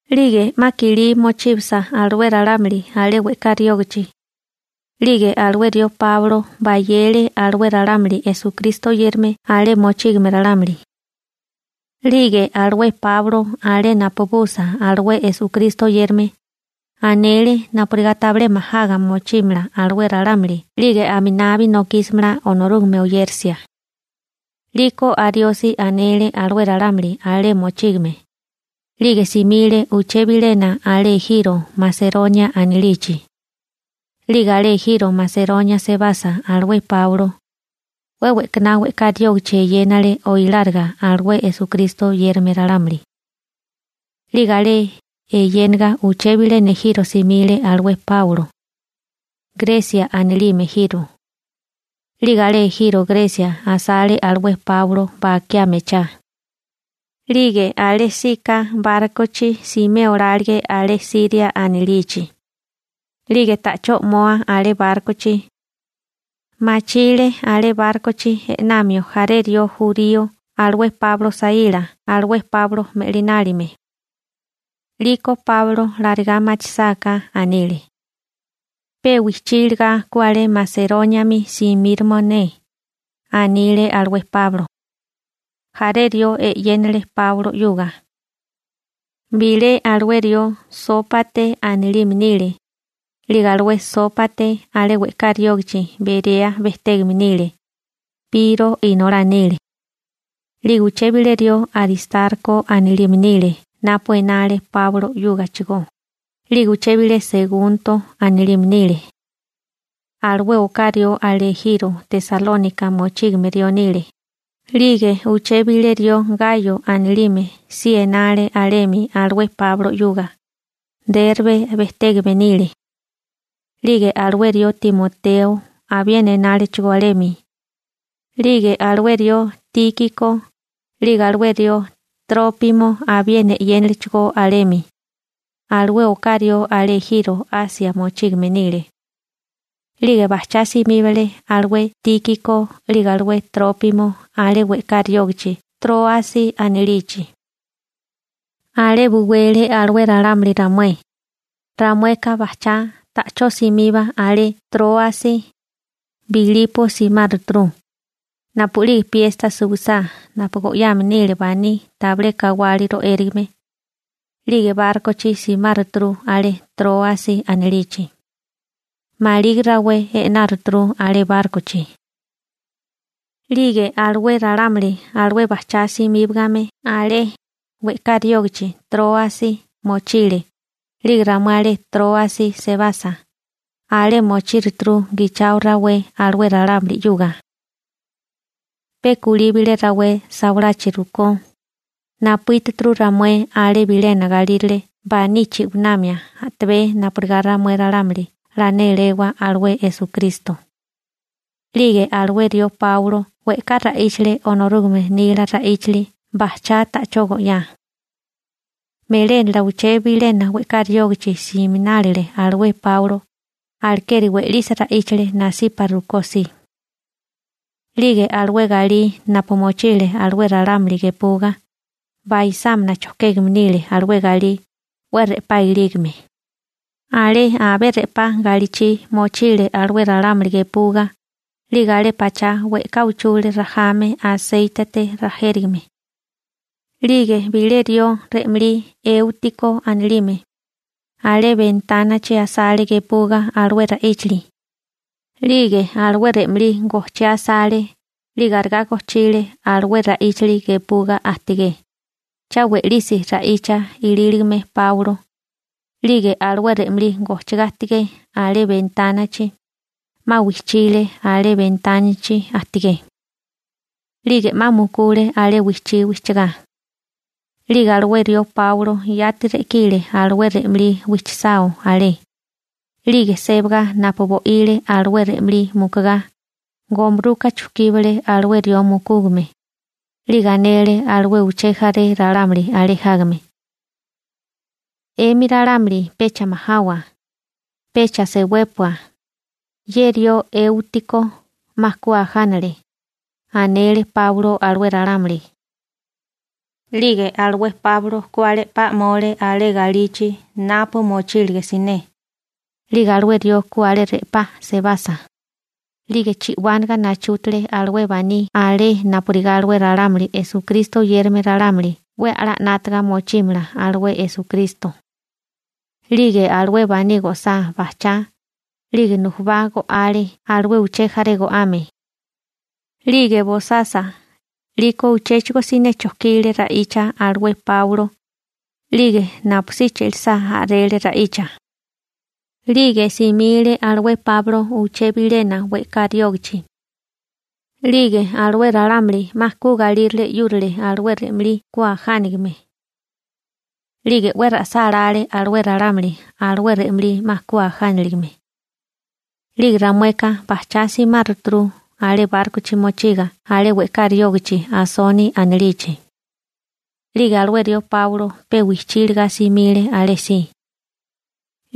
'Lige 'ma kilí mochíbasa alué ralámuli alé we'ká riógichi, 'lige alué rió Páulo bayele alué ralámuli Esukristo oyérame alé mochígame ralámuli. 'Lige alué Páulo alé napubusa alué Esukristo oyérame, anele napurigá tabilé majaga mochímala alué ralámuli 'lige aminabi nokísimala Onorúgame oyérisia. 'Liko ariosi anele alué ralámuli alé mochígame, 'lige simile uché bilena alé ejiro Maseronia anilichi. 'Lige alé ejiro Maseronia sebasa alué Páulo, 'we we'kaná we'ká riógichi eyénale oiláriga alué Esukristo oyérame ralámuli. 'Lige alé eyéniga uché bilena ejiro simile alué Páulo, Gresia anilime ejiro. 'Lige alé ejiro Gresia asale alué Páulo bakiá mechá. 'Lige alésíko bárkochi simé olálige alé Siria anilichi, 'lige ta'chó 'moa alé bárkochi, machile alé bárkochi e'namio jaré rió jurío alué Páulo saíla alué Páulo me'linálime. 'Liko Páulo larigá machisáká, anile: ―Pe wijchí iligá ku alé Maseróniami simíroma ne ―anile alué Páulo. Jaré rió 'yénale Páulo 'yuga. Bilé alué rió Sópate anilime nile, 'lige alué Sópate alé we'ká riógichi Berea bejtégame nile, Piro inolá nile. 'Lige uché bilé rió Aristarko anilime nile napu enale Páulo 'yúgachigó, 'lige uché bilé Segunto anilime nile. Alué oká rió alé ejiro Tesalónika mochígame rió nile. 'Lige uché bilé rió Gayo anilime si enale alemi alué Páulo 'yuga, Rerbe bejtégame nile. 'Lige alué rió Timoteo abiena enálechigó alemi. 'Lige alué rió Tíkiko, 'lige alué Trópimo abiena 'yénalechigó alemi. Alué oká rió alé ejiro Asia mochígame nile. 'Lige bajchá simíbale alué Tíkiko 'lige alué Trópimo alé we'ká riógichi Tróasi anilichi. Alé buwele alué ralámuli ramué. Ramueka bajchá, ta'chó simiba alé Tróasi, Bilipo simáruturu. Napu'lige piesta suwisá napu go'yame nile baní tabilé kawali ro'érigame, 'lige bárkochi simáruturu alé Tróasi anilichi. Maligi rawé e'náruturu alé bárkochi. 'Lige alué ralámuli alué bajchá simíbagame alé, we'ká riógichi Tróasi mochile. 'Lige ramué alé Tróasi sebasa, alé mochíruturu gichao rawé alué ralámuli 'yuga. Pe kulí bilé rawé sawalachi rukó, napuítuturu ramué alé bilena galírale baní chi'winamia a'tabé napurigá ramué ralámuli 'la néláwa alué Esukristo. 'Lige alué rió Páulo we'ká ra'íchale Onorúgame nila ra'íchali bajchá ta'chó go'yá. Melénala uché bilena we'ká riógichi siminálile alué Páulo, alekeri we'lisi ra'íchale nasipa rukó si. 'Lige alué galí napu mochile alué ralámuli gepuga, baisámina chojkégame nile alué galí 'we re'pá ilígame. Alé abé re'pá galichi mochile alué ralámuli gepuga. 'Lige alé pachá we'ká uchule rajame aséitete rajérigame. 'Lige bilé rió re'malí Eútiko anilime, alé bentánachi asale gepuga alué ra'íchali. 'Lige alué re'malí gojchiá asale 'lige arigá gojchile alué ra'íchali gepuga ajtigé, cha we'lisi ra'icha ilíligame Páulo. 'Lige alué re'malí gojchigá ajtigé alé bentánachi, 'ma wijchile alé bentánachi ajtigé, 'lige 'ma mukule alé wijchí wijchigá. 'Lige alué rió Páulo yati re'kile alué re'malí wijchisao alé. 'Lige sébaga napu bo'ile alué re'malí mukugá, gomuruka chujkíbale alué rió mukúgame, 'lige anele alué uché jaré ralámuli alé jágame: ―'Emi ralámuli pecha majawa, pecha sewépua, ye rió Eútiko 'ma ku ajánale ―anele Páulo alué ralámuli. 'Lige alué Páulo ku alé 'pa 'mole alé galichi napu mochílige siné. 'Lige alué rió ku alé re'pá sebasa, 'lige chi'wánaga nachútale alué baní alé napurigá alué ralámuli Esukristo oyérame ralámuli 'we a'lá 'nátaga mochímala alué Esukristo. 'Lige alué baní go'sá bajchá, 'lige nujubá go'ale alué uché jaré go'ame. 'Lige bosasa, 'liko uchéchigo siné chojkile ra'icha alué Páulo, 'lige napusí che'lisá a'rele ra'icha. 'Lige simile alué Páulo uché bilena we'ká riógichi. 'Lige alué ralámuli 'ma ku galírale 'yúrale alué re'malí ku ajánigame. 'Lige 'we ra'sálále alué ralámuli alué re'malí 'ma ku ajániligame. 'Lige ramueka bajchá simáruturu alé bárkochi mochiga alé we'ká riógichi Asoni anilichi. 'Lige alué rió Páulo pe wijchí iligá simile alésí.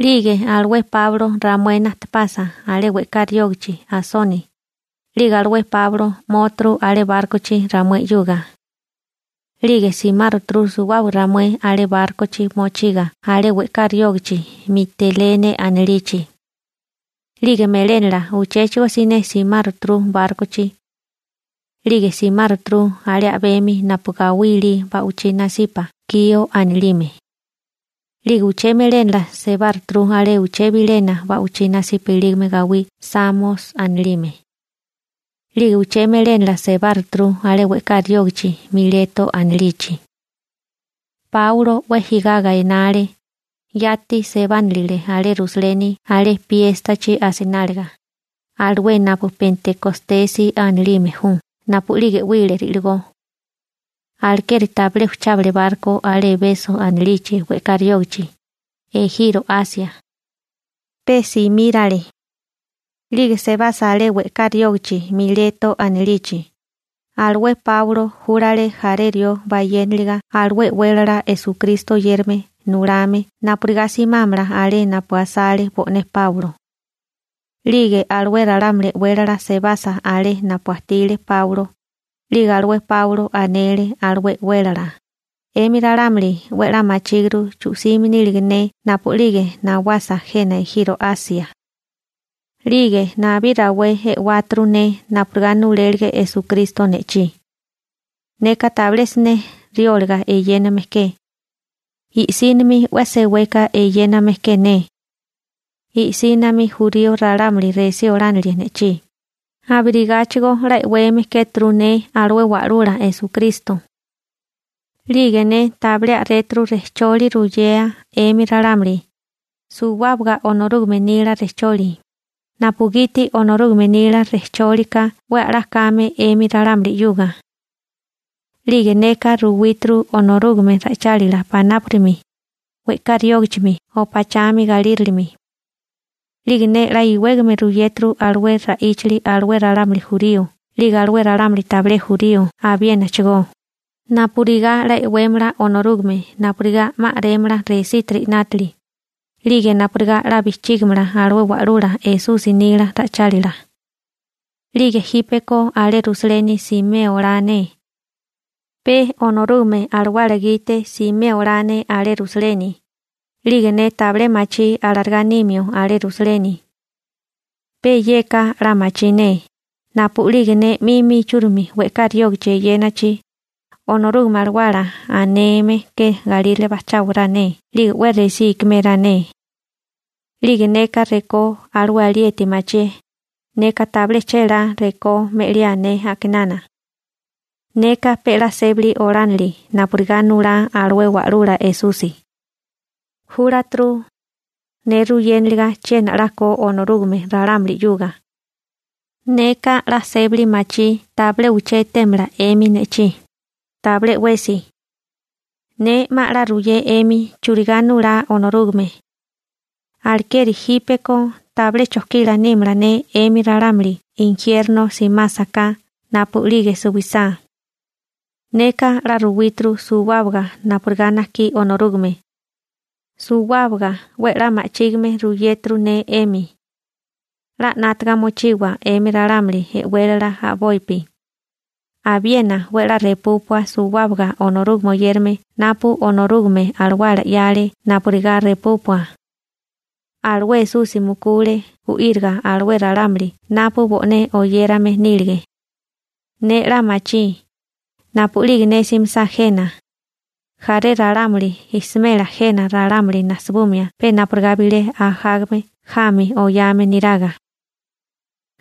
'Lige alué Páulo ramué najtepasa alé we'ká riógichi Asoni, 'lige alué Páulo 'móturu alé bárkochi ramué 'yuga. 'Lige simáruturu suwábaga ramué alé bárkochi mochiga alé we'ká riógichi Mitelene anilichi. 'Lige melénala uchéchigo siné simáruturu bárkochi. 'Lige simáruturu alé a'bemi napu gawí ilí ba'wichí nasipa Kio anilime. 'Lige uché melénala sebáruturu alé uché bilena ba'wichí nasipa ilígame gawí Samos anilime. 'Lige uché melénala sebáruturu alé we'ká riógichi Mileto anilichi. Páulo 'we jigaga enale, yati sebánilile alé Rusaleni alé piéstachi asináliga, alué napu Pentikostesi anilime ju napu'lige 'wile ri'ligó. Alekeri tabilé ujchábale barko alé Ebeso anilichi we'ká riógichi, ejiro Asia. Pe simírale. 'Lige sebasa alé we'ká riógichi Mileto anilichi, alué Páulo júlale jaré rió bayénaliga alué e'wélala Esukristo oyérame nulame napurigá simámala alé napu asale bo'né Páulo. 'Lige alué ralámuli e'wélala sebasa alé napu ajtile Páulo, 'lige alué Páulo anele alué e'wélala: ―'Emi ralámuli 'we a'lá machíguru chu'sime nílige ne napu'lige nawasa jena ejiro Asia. 'Lige nabí rawé e'wáturu ne napurigá nulélige Esukristo ne'chí. Neka tabilé siné rióliga eyéname ke. I'sínimi 'we seweka eyéname ke ne. I'sínami jurío ralámuli resí olánile ne'chí, abirigáchigo 'la e'weme kéturu ne alué Wa'lula Esukristo. 'Lige ne tabilé a'réturu rejcholi ruyea 'emi ralámuli, suwábaga Onorúgame nila rejcholi, napugiti Onorúgame nila rejcholi ka 'we a'lá kame 'emi ralámuli 'yuga. 'Lige neka ruwíturu Onorúgame ra'ichálila panápurimi, we'ká riógachimi o pachami galírilimi. 'Lige ne 'la iwégame ruyéturu alué ra'íchali alué ralámuli jurío 'lige alué ralámuli tabilé jurío abiénachigó, napurigá 'la e'wémala Onorúgame napurigá 'ma a'rémala resítiri 'nátili, 'lige napurigá 'la bijchígimala alué Wa'lula Esusi nila ra'ichálila. › 'Lige jípeko alé Rusaleni simé olá ne. Pe Onorúgame Alawala gite simé olá ne alé Rusaleni, 'lige ne tabilé machí alarigá nimio alé Rusaleni. Pe yeka 'la machí ne: napu'lige ne 'mimi ichúrimi we'ká riógichi eyénachi, Onorúgame Alawala aneme ke galírale bajcháwará ne 'lige 'we resí ikiméará ne. 'Lige neka rekó alué alieti machié, neka tabilé chélá rekó me'liae ne a'kinana. Neka pe 'la sébali olánili napurigá nulá alué Wa'lula Esusi. Júlaturu ne ruyéniliga chiena 'la ko Onorúgame ralámuli 'yuga. › Neka 'la sébali machí tabilé uché etémala 'emi ne'chí, tabilé 'wesi. Ne 'ma 'la ruyé 'emi churigá nulá Onorúgame. Alekeri jípeko tabilé chojkila nímala ne 'emi ralámuli injierno simásaká napu'lige suwisá. Neka 'la ruwíturu suwábaga napurigá najkí Onorúgame. Suwábaga 'we 'la ma'chígime ruyéturu ne 'emi. 'La 'nátaga mochiwa 'emi ralámuli e'wélala a'bopi. Abiena 'we 'la repúpua suwábaga Onorúgame oyérame napu Onorúgame Alawala 'yale napurigá repúpua. Alué Esusi mukule gu'íriga alué ralámuli napu bo'né oyérame nílige. Ne 'la machí, napu'lige ne simisá jena, jaré ralámuli jsmela jena ralámuli najsibumia pe napurigá bilé ajágame jami oyame niraga.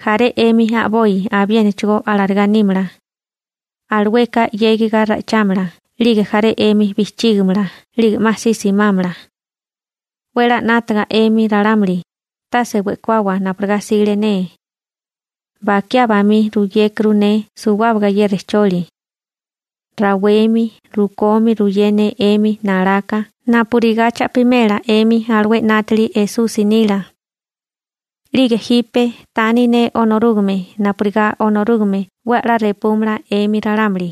Jaré 'emi a'boi abiénachigó alarigá nímala. Alueka 'yégiga ra'ichámala 'lige jaré 'emi bijchígimala 'lige 'ma si simámala. 'We 'la 'nátaga 'emi ralámuli, tase we'kawawa napurigá 'sile ne. Bakiá bamí ruyékuru ne suwábaga ye rejcholi. Rawemi rukomi ruyé ne 'emi nalaka napurigá cha'pimela 'emi alué 'nátili Esusi nila. › 'Lige jipe tani ne Onorúgame napurigá Onorúgame 'we a'lá repúmala 'emi ralámuli.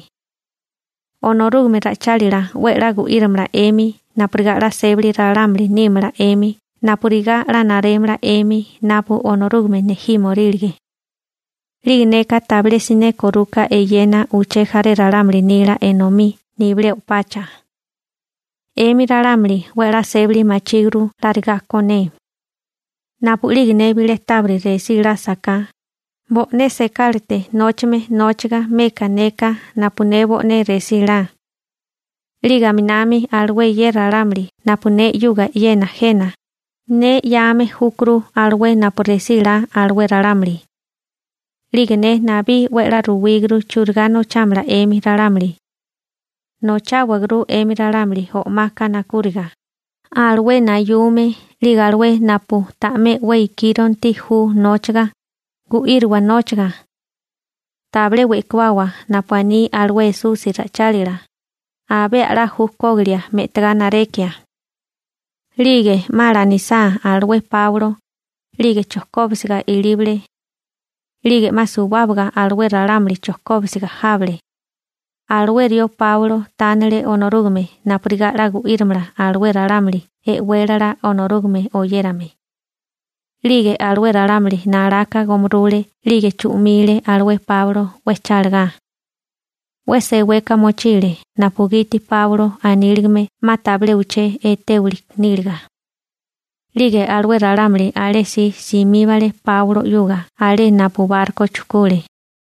Onorúgame ra'ichálila 'we 'la gu'írimala 'emi napurigá 'la sébali ralámuli nímala 'emi napurigá 'la narémala 'emi napu Onorúgame nejímorílige. 'Lige neka tabilé siné koruka eyena uché jaré ralámuli nila enomí nibilé o'pacha. 'Emi ralámuli 'we a'lá sébali machíguru larigá ko ne. Napu'lige ne bilé tábiri resí lásaká, bo'né sekálate nóchame nóchiga meka neka napu ne bo'né resí la. 'Lige aminami alué ye ralámuli napu ne 'yuga eyena jena, ne 'yame júkuru alué napu resí 'la alué ralámuli. 'Lige ne nabí 'we a'lá ruwíguru churigá nochámala 'emi ralámuli. Nocháwaguru 'emi ralámuli o'maka nakúriga, alué nayume 'lige alué napu ta'mé 'we ikíronti ju nóchaga, gu'írowa nóchaga. Tabilé we'kawawa napu aní alué Esusi ra'ichálila: «Abé a'lá ju kógilia me'tagá narekia.» 'Lige 'ma lanisá alué Páulo, 'lige chojkóbisiga ilíbale. 'Lige 'ma suwábaga alué ralámuli chojkóbisiga jábale. Alué rió Páulo tánele Onorúgame napurigá 'la gu'írimala alué ralámuli e'wélala Onorúgame oyérame. 'Lige alué ralámuli nalaka gomurule 'lige chu'mile alué Páulo 'we chálagá. 'We seweka mochile napugiti Páulo aníligame 'ma tabilé uché etéwili níliga. 'Lige alué ralámuli alé si simíbale Páulo 'yuga alé napu barko chujkule.